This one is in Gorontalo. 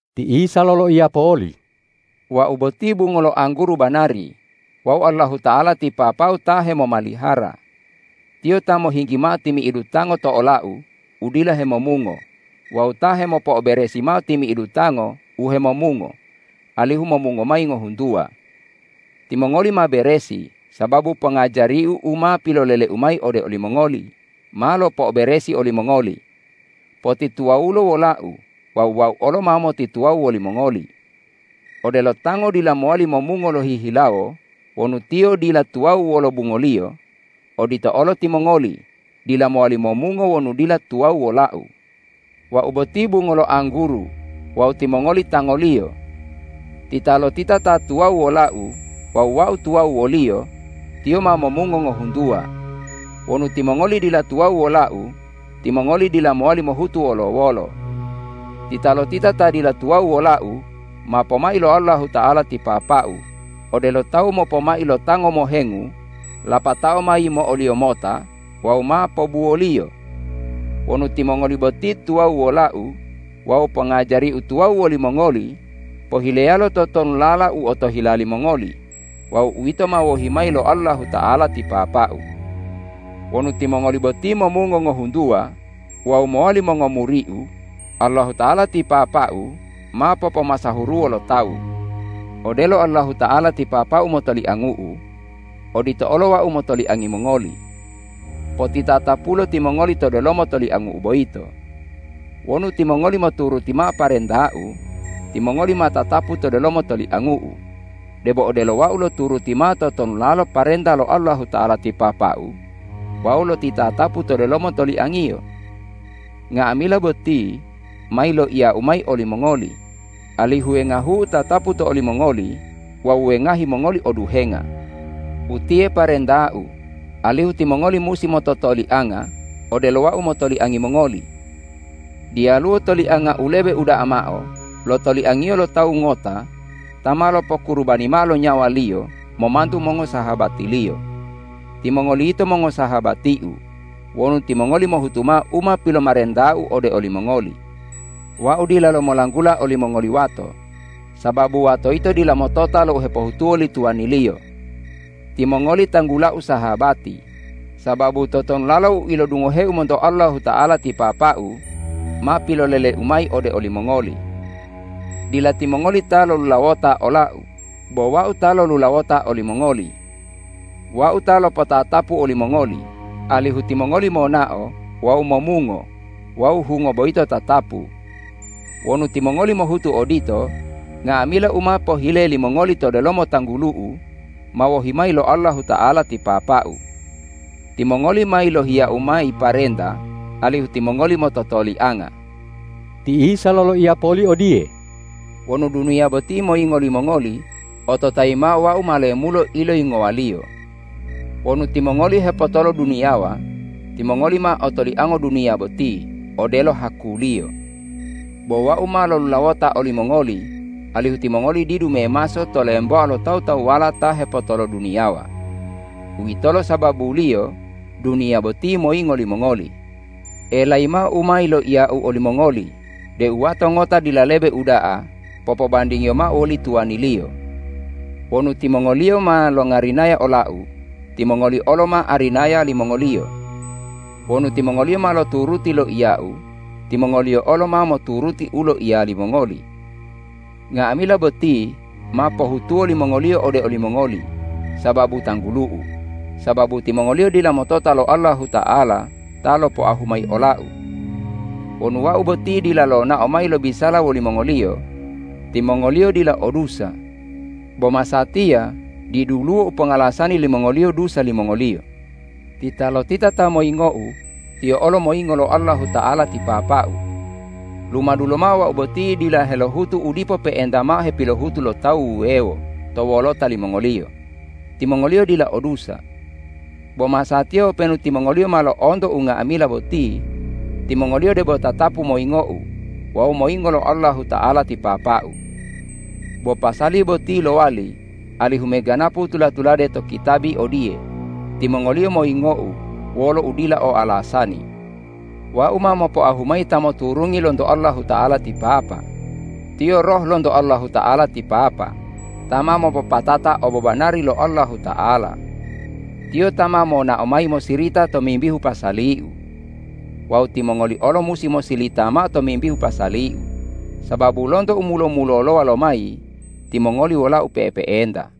Ti Isa loloiya poli,”Wau boti bungo lo angguru banari wawu Allahuta'ala ti Papa-U ta hemomalihara. Tiyo ta mohinggi mao timi'idu tango to ola-U udila hemomungo wawu ta hemopo'oberesi mao timi'idu tango u hemomungo alihu momungo mayi ngohuntuwa. Timongoli ma beresi sababu pongajari-U u ma pilolele-U mayi ode olimongoli ma lopo'oberesi olimongoli. Potituwawulo wola-U wawu Wau olo ma motituwawu wolimongoli. Odelo tango dila mowali momungo lohihilawo wonu tiyo dila tuwawu wolo bungoliyo, odito olo timongoli dila mowali momungo wonu dila tuwawu wola-U. Wau boti bungo lo angguru wawu timongoli tangoliyo. Titalotita ta tuwawu wola-U wawu Wau tuwawu woliyo, tiyo ma momungo ngohuntuwa. Wonu timongoli dila tuwawu wola-U, timongoli dila mowali mohutu wolo-wolo. Titalotita ta dila tuwawu wola-U, ma pomai lo Allahuta'ala ti Papa-U, odelo tawu mopomai lo tango mohengu lapatao ma yimo'oliyo mota wawu ma pobuwoliyo. Wonu timongoli boti tuwawu wola-U wawu pongajari-U tuwawu wolimongoli, pohileyalo totonulala u otohila limongoli wawu uwito ma wohi mayi lo Allahuta'ala ti Papa-U. Wonu timongoli boti momungo ngohuntuwa wawu mowali mongomuri-U, Allahuta'ala ti Papa-U ma popomasahuruwo lo tawu. Odelo Allahuta'ala ti Papa-U motoliangu-U, odito olo Wau motoliangi mongoli. Potitatapulo timongoli to delomo toliangu-U boyito. Wonu timongoli moturuti mao parenta-U, timongoli ma tatapu to delomo toliangu-U, debo odelo Wau loturuti mao totonulalo parenta lo Allahuta'ala ti Papa-U wawu lotitatapu to delomo toliang-Iyo. Nga'amila boti ma yiloiya-U mayi olimongoli, alihu wengahu-U tatapu to olimongoli wawu wengahi mongoli oduhenga. Utiye parenta-U, alihu timongoli musi mototolianga odelo Wau motoliangi mongoli. Diyaluwo tolianga u lebe uda'a mao lo toliangiyo lo tawu ngota ta ma lopokurubani mao lo nyawaliyo momantu mongosahabatiliyo. Timongoli yito mongosahabati-U wonu timongoli mohutu mao u ma pilomarenta-U ode olimongoli. Wau dilalo molanggula olimongoli wato, sababu wato yito dila motota lo u hepohutuwo li tuwaniliyo. Timongoli tanggula-U sahabati, sababu totonulalo u ilodungohe-U monto Allahuta'ala ti Papa-U ma pilolele-U mayi ode olimongoli. Dila timongoli ta lolulawota ola-U, bo Wau ta lolulawota olimongoli. Wau ta lopotatapu olimongoli, alihu timongoli monao wawu momungo wawu hungo boyito tatapu. Wonu timongoli mohutu odito, nga'amila u ma pohile limongoli to delomo tanggulu-U ma wohi mayi lo Allahuta'ala ti Papa-U. Timongoli ma yilohiya-U mayi parenta alihu timongoli mototolianga.” Ti Isa loloiya poli odiye,”Wonu duniya boti moyingo limongoli, ototayi mao: Wau ma lemulo iloyingowaliyo. Wonu timongoli hepotoloduniyawa, timongoli ma otoliango duniya boti odelo hakuliyo. Bo Wau ma lolulawota olimongoli, alihu timongoli didu memaso to lemboa lo tawu-tawuwala ta hepotoloduniyawa. Uwitolo sababuliyo duniya boti moyingo limongoli. Elayi mao u ma yiloiya-U olimongoli deu wato ngota dila lebe uda'a popobandingiyo mao woli tuwaniliyo. Wonu timongoliyo ma longarinaya ola-U, timongoli olo ma arinaya limongoliyo. Wonu timongoliyo ma loturuti loiya-U, timongoliyo olo ma moturuti u loiya limongoli. Nga'amila boti ma pohutuwo limongoliyo ode olimongoli sababu tanggulu-U, sababu timongoliyo dila motota lo Allahuta'ala ta lopoahu mayi ola-U. Wonu Wau boti dila lonao mayi lobisala wolimongoliyo, timongoliyo dila o dusa. Bo masatiya diduluwo u pongalasani limongoliyo dusa limongoliyo. Titalotita ta moyingo-U, tiyo olo moyingo lo Allahuta'ala ti Papa-U. Lumadu lomao Wau boti dila helohutu u dipo pe'enta mao hepilohutu lo tawu wuwewo to wolota limongoliyo, timongoliyo dila o dusa. Bo masatiya openu timongoliyo ma lo'onto unga'amila boti, timongoliyo debo tatapu moyingo-U wawu moyingo lo Allahuta'ala ti Papa-U. Bo pasali boti lowali alihu meganapu u tula-tulade to kitabi odiye, ’Timongoliyo moyingo-U wolo udila o alasani.’ Wau ma mopoahu mayi Ta moturungi lonto Allahuta'ala ti Papa, Tiyo Roh lonto Allahuta'ala ti Papa, ta ma mopopatata obobanari lo Allahuta'ala. Tiyo ta ma monao mayi mosirita tomimbihu pasali-U. Wawu timongoli olo musi mosilita mao tomimbihu pasali-U, sababu lonto u mulo-mulolowa lomayi timongoli wola-U pe'epe'enta.